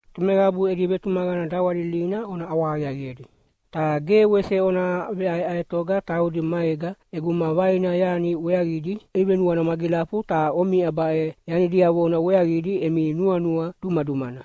Tomeqabu edi vetumaqana dawalilina ona ʼawahaqiaqiedi, ta ge wese ona veʼaeʼaetoga taudi maega ʼeguma vaina yani weaqidi ivenuana magilafu ta omiʼa baʼe yani diavona weaqidi emi nuanua dumadumana.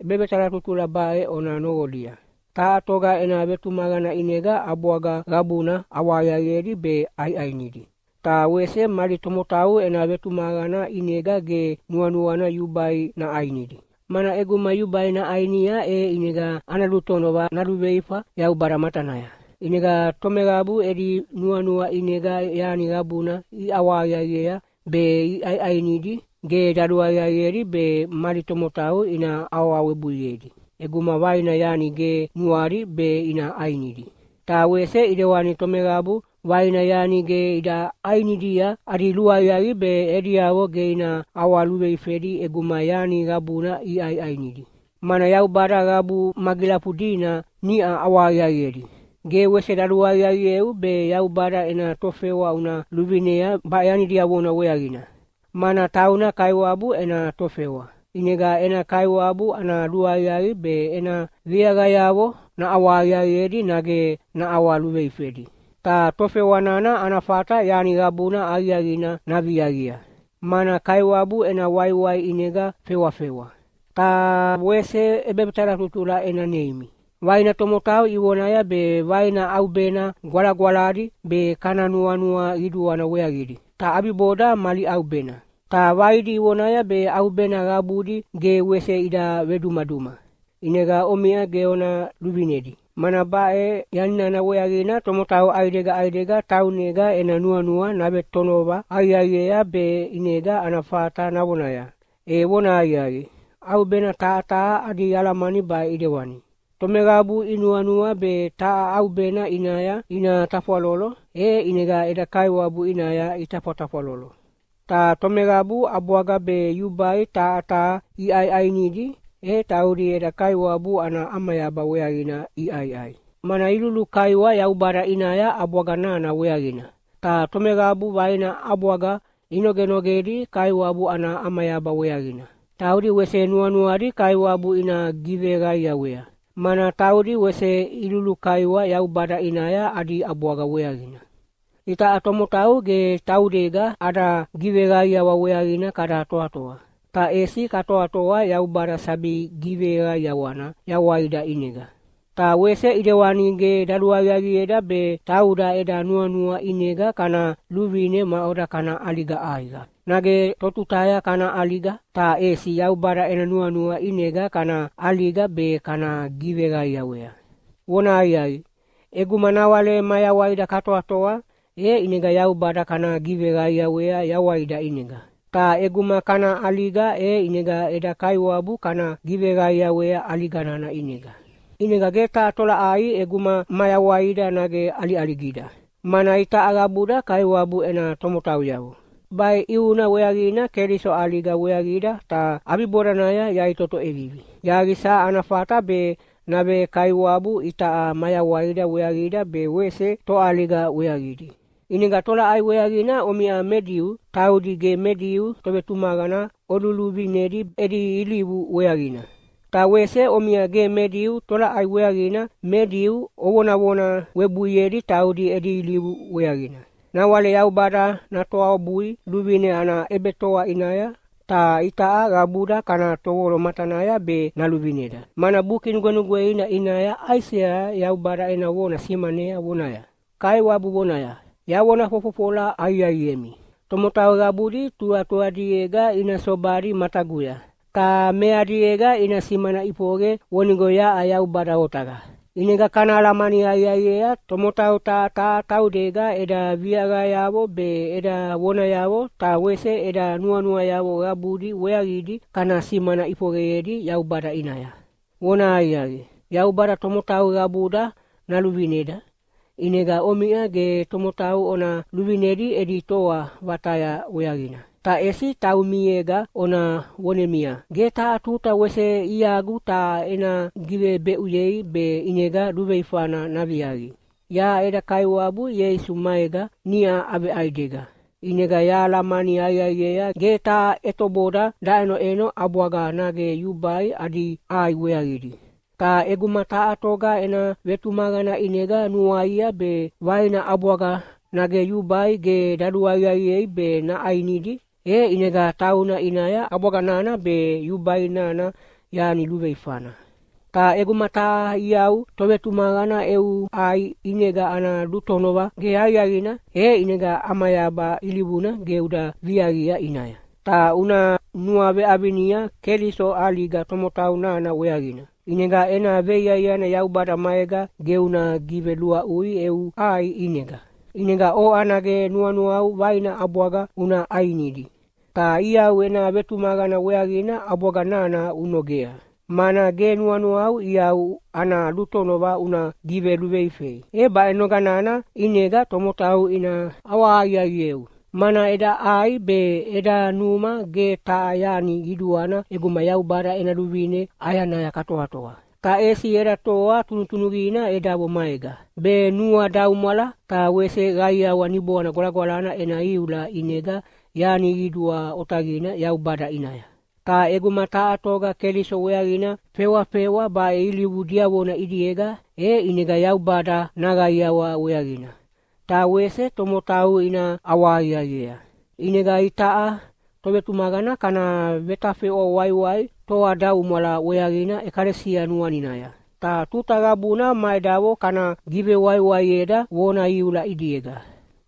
ʼEbevetalatutula baʼe ona noqolia: Taha toga ena vetumaqana ʼinega ʼabwaga qabuna ʼawahaqiaqiedi be ʼaiʼainidi. Ta wese mali tomotau ena vetumaqana ʼinega ge nuanuana yubai naʼainidi, mana ʼeguma yubai naʼainia e ʼinega ana lutonova naluveifa Yaubada matanaya. ʼInega tomeqabu edi nuanua ʼinega yani qabuna iʼawahaqiaqiea be iʼaiʼainidi, ge daluaqiaqiedi be mali tomotau ina awawebuiedi ʼeguma vaina yani ge nuadi be ina ʼainidi. Ta wese ʼidewani tomeqabu vaina yani ge ida ʼainidia, adi luaqiaqi be ediavo ge ina ʼawaluveifedi ʼeguma yani qabuna iʼaiʼainidi. Mana Yaubada qabu magilafudina niʼa ʼawahaqiaqiedi. Ge wese daluaqiaqieu be Yaubada ena tofewa una luvinea baʼe yani diavona weaqina, mana tauna Kaiwabu ena tofewa, ʼinega ena Kaiwabu ana luaqiaqi be ena viaqayavo naʼawahaqiaqiedi nage naʼawaluveifedi. Ta tofewa nana ana fata yani qabuna aqiaqina naviaqia, mana Kaiwabu ena waiwai ʼinega fewafewa. Taha wese ʼebevetalatutula ena neimi: Vaina tomotau ivonaya be vaina ʼaubena gwalagwaladi be kana nuanua qiduana weaqidi, ta ʼabiboda mali ʼaubena. Ta vaidi ivonaya be ʼaubena qabudi ge wese ida vedumaduma. ʼInega omiʼa ge ona luvinedi, mana baʼe yani nana weaqina tomotau ʼaidega ʼaidega taunega ena nuanua navetonova aqiaqiea be ʼinega ana fata navonaya, “E vonahaqiaqi, ʼaubena taha taha adi alamani baʼe ʼidewani!” Tomeqabu inuanua be taha ʼaubena ʼinaya ina tafwalolo, e ʼinega eda Kaiwabu ʼinaya itafwatafwalolo. Ta tomeqabu ʼabwaga be yubai taha taha iʼaiʼainidi, e taudi eda Kaiwabu ana ʼamayaba weaqina iʼaiʼai, mana ilulukaiwa Yaubada ʼinaya ʼabwaga nana weaqina. Ta tomeqabu vaina ʼabwaga inogenogedi Kaiwabu ana ʼamayaba weaqina, taudi wese nuanuadi Kaiwabu ina giveqaiawea, mana taudi wese ilulukaiwa Yaubada ʼinaya adi ʼabwaga weaqina. Itaʼa tomotau ge taudega ada giveqaiawa weaqina kada toatoa, ta ʼesi katoatoa Yaubada sabi giveqaiawana yawaida ʼinega. Ta wese ʼidewani ge daluaqiaqieda be tauda eda nuanua ʼinega kana luvine maʼoda kana ʼaliga ʼaiqa, nage totutaya kana ʼaliga, ta ʼesi Yaubada ena nuanua ʼinega kana ʼaliga be kana giveqaiawea. Vonahaqiaqi, ʼeguma nawale mayawaida katoatoa, e ʼinega Yaubada kana giveqaiawea yawaida ʼinega. Ta ʼeguma kana ʼaliga, e ʼinega eda Kaiwabu kana giveqaiawea ʼaliga nana ʼinega. ʼInega ge taha tolaʼai ʼeguma mayawaida nage ʼaliʼaligida, mana itaʼa qabuda Kaiwabu ena tomotauyavo. Baʼe ʼiuna weaqina Keliso ʼaliga weaqida ta ʼabibodanaya yaʼitoto ʼevivi, yaqisa ana fata be nave-Kaiwabu itaʼa mayawaida weaqida be wese toʼaliga weaqidi. ʼInega tolaʼai weaqina omiʼa me Diu taudi ge me Diu tovetumaqana oluluvinedi edi ilivu weaqina? Ta wese omiʼa ge me Diu tolaʼai weaqina me Diu ovonavona webuiedi taudi edi ilivu weaqina? Nawale Yaubada natoabui luvine ana ʼebetoa ʼinaya, ta itaʼa qabuda kana tovolo matanaya be naluvineda. Mana Buki Nugwenugweina ʼinaya Aisea Yaubada ena vona simanea vonaya, “Kaiwabu vonaya, ‘Yavona fofofola aqiaqiemi, tomotau qabudi tuqatuqadiega ina sobadi mataguya, ta meadiega ina simana ʼifoqe vonigo yaʼa Yaubada Otaqa.’” ʼInega kana alamani aqiaqiea, tomotau taha taha taudega eda viaqayavo be eda vonayavo ta wese eda nuanuayavo qabudi weaqidi kana simana ʼifoqeyedi Yaubada ʼinaya. Vonahaqiaqi, Yaubada tomotau qabuda naluvineda, ʼinega omiʼa ge tomotau ona luvinedi edi toa vataya weaqina. Ta ʼesi taumiega ona vonemia, “Ge taha tuta wese iagu taha ena givebeʼuyei be ʼinega luveifana naviaqi.” Yaʼa eda Kaiwabu Ieisu maega niʼa aveʼaidega, ʼinega yahalamani aqiaqiea ge taha ʼetoboda daʼenoʼeno ʼabwaga nage yubai adi ʼai weaqidi. Ta ʼeguma taha toga ena vetumaqana ʼinega nanuaia be vaina ʼabwaga nage yubai ge daluaqiaqiei be naʼainidi, e ʼinega tauna ʼinaya ʼabwaga nana be yubai nana yani luveifana. Ta ʼeguma taha iau tovetumaqana eu ʼai ʼinega ana lutonova ge aqiaqina, e ʼinega ʼamayaba ilivuna ge uda viaqia ʼinaya. Ta una nuaveʼavinia Keliso ʼaliga tomotau nana weaqina, ʼinega ena veiaiana Yaubada maega ge una giveluaʼui eu ʼai ʼinega. ʼInega oʼa nage nuanuau vaina ʼabwaga una ʼainidi, ta iau ena vetumaqana weaqina ʼabwaga nana unogea, mana ge nuanuau iau ana lutonova una giveluveifei. E baʼe noga nana ʼinega tomotau ina ʼawahaqiaqieu. Mana eda ʼai be eda numa ge taha yani qiduana ʼeguma Yaubada ena luvine ʼayanaya katoatoa. Ta ʼesi eda toa tunutunuqina edavo maega, be nuadaumwala ta wese qaiawa Niboana Gwalagwalana ena iula ʼinega yani qidua otaqina Yaubada ʼinaya. Ta ʼeguma taha toga Keliso weaqina fewafewa baʼe ilivu diavona ʼidiega, e ʼinega Yaubada naqaiawa weaqina, ta wese tomotau ina ʼawahaqiaqiea. ʼInega itaʼa tovetumaqana kana vetafeʼwa waiwai toadaumwala weaqina ʼekalesia nuaninaya, ta tuta qabuna ma edavo kana givewaiwaieda vona iula ʼidiega.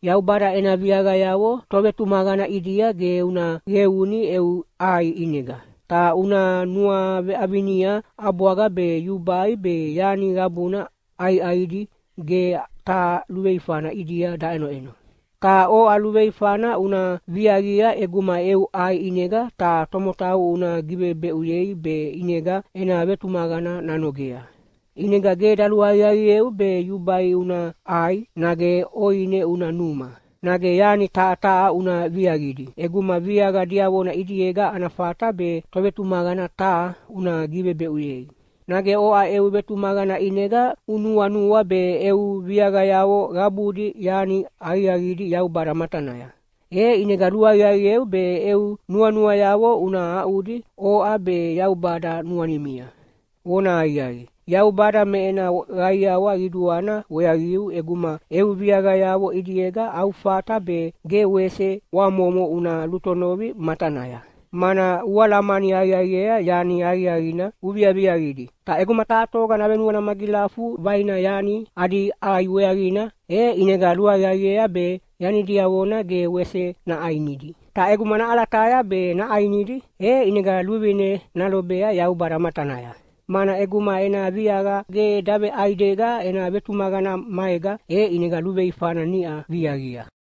Yaubada ena viaqayavo tovetumaqana ʼidia ge una qeuni eu ʼai ʼinega. Ta una nuaveʼavinia, ʼabwaga be yubai be yani qabuna ʼaiʼaidi ge taha luveifana ʼidia daʼenoʼeno. Ta oʼa luveifana una viaqia ʼeguma eu ʼai ʼinega taha tomotau una givebeʼuyei be ʼinega ena vetumaqana nanogea. ʼInega ge daluaqiaqieu be yubai una ʼai, nage ʼoine una numa, nage yani taha taha una viaqidi ʼeguma viaqa diavona ʼidiega ana fata be tovetumaqana taha una givebeʼuyei. Nage oʼa eu vetumaqana ʼinega unuanua be eu viaqayavo qabudi yani aqiaqidi Yaubada matanaya. E ʼinega luaqiaqieu be eu nuanuayavo una aʼudi oʼa be Yaubada nuanimia. Vonahaqiaqi, Yaubada me ena qaiawa qiduana weaqiu ʼeguma eu viaqayavo ʼidiega au fata be ge wese ʼwamomo una lutonovi matanaya, mana ualamani aqiaqiea yani aqiaqina uviaviaqidi. Ta ʼeguma taha toga navenuana magilafu vaina yani adi ʼai weaqina, e ʼinega luaqiaqiea be yani diavona ge wese naʼainidi. Ta ʼeguma naʼalataya be naʼainidi, e ʼinega luvine nalobea Yaubada matanaya, mana ʼeguma ena viaqa ge daveʼaidega ena vetumaqana maega, e ʼinega luveifana niʼa viaqia.